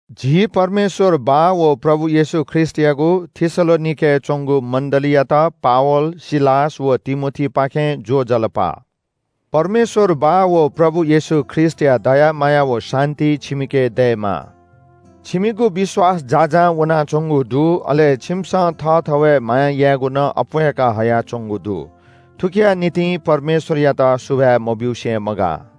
झी परमेश्‍वर बाः व प्रभु येशू ख्रीष्‍टयागु थेसलोनिकेय् च्‍वंगु मण्‍डलीयात पावल, सिलास व तिमोथीपाखें ज्‍वजलपा। परमेश्‍वर बाः व प्रभु येशू ख्रीष्‍टया दया माया व शान्‍ति छिमिके दयेमा। छिमिगु विश्‍वास यक्‍व अप्‍वयावनाच्‍वंगु दु, अले छिमिसं थःथवय् माया यायेगु नं अप्‍वय्‌का हयाच्‍वंगु दु। थुकिया निंतिं परमेश्‍वरयात सुभाय् मब्‍यूसे मगाः।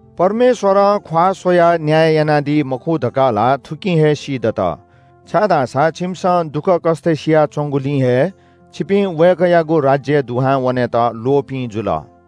परमेश्‍वरं ख्‍वाः स्‍वयाः न्‍याय यानादी मखु धकाः ला थुकिं हे सीदत, छाय्‌धाःसा छिमिसं दुःखकष्‍ट सियाच्‍वंगुलिं हे छिपिं वय्‌कःयागु राज्‍यय् दुहां वनेत ल्‍वःपिं जुल।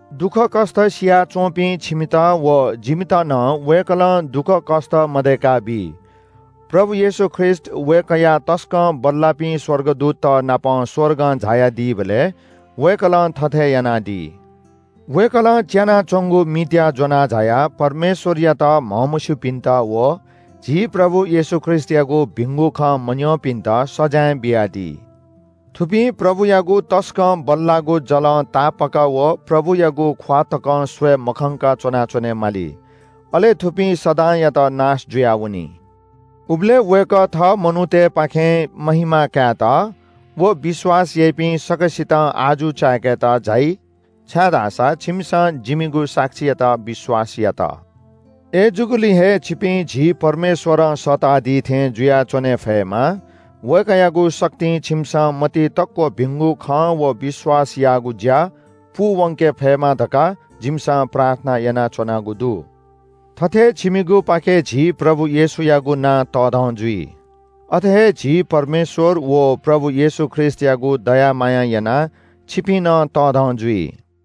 दुःखकष्‍ट सियाच्‍वंपिं छिमित व जिमित नं वय्‌कलं दुःखकष्‍ट मदय्‌काबी। प्रभु येशू ख्रीष्‍ट वय्‌कःया तसकं बल्‍लाःपिं स्‍वर्गदूतत नाप स्‍वर्गं झायादीबलय् वय्‌कलं थथे यानादी। वय्‌कलं च्‍यानाच्‍वंगु मित्‍याः ज्‍वना झायाः परमेश्‍वरयात म्‍हमस्‍यूपिन्‍त व झी प्रभु येशू ख्रीष्‍टयागु भिंगु खँ मन्‍यंपिन्‍त सजाँय बियादी। थुपिं प्रभुयागु तसकं बल्‍लाःगु जलं तापाक व प्रभुयागु ख्‍वाः तकं स्‍वये मखंक च्‍वनाच्‍वने माली। अले थुपिं सदांयात नाश जुयावनी। उबलय् वय्‌कः थः मनूतय्‌पाखें महिमा कायेत व विश्‍वास याइपिं सकसितं अजू चाय्‌केत झाइ छाय्‌धाःसा छिमिसं जिमिगु साक्षीयात विश्‍वास यात। अय्‌जूगुलिं हे छिपिं झी परमेश्‍वरं सःतादी थें जुयाच्‍वने फयेमा, वय्‌कःयागु शक्तिं छिमिसं मतिइ तक्‍व भिंगु खँ व विश्‍वासयागु ज्‍या पूवंके फयेमा धकाः जिमिसं प्रार्थना यानाच्‍वनागु दु। थथे छिमिगुपाखें झी प्रभु येशूयागु नां तःधं जुइ, अथे हे झी परमेश्‍वर व प्रभु येशू ख्रीष्‍टयागु दया मायां यानाः छिपिं नं तःधं जुइ।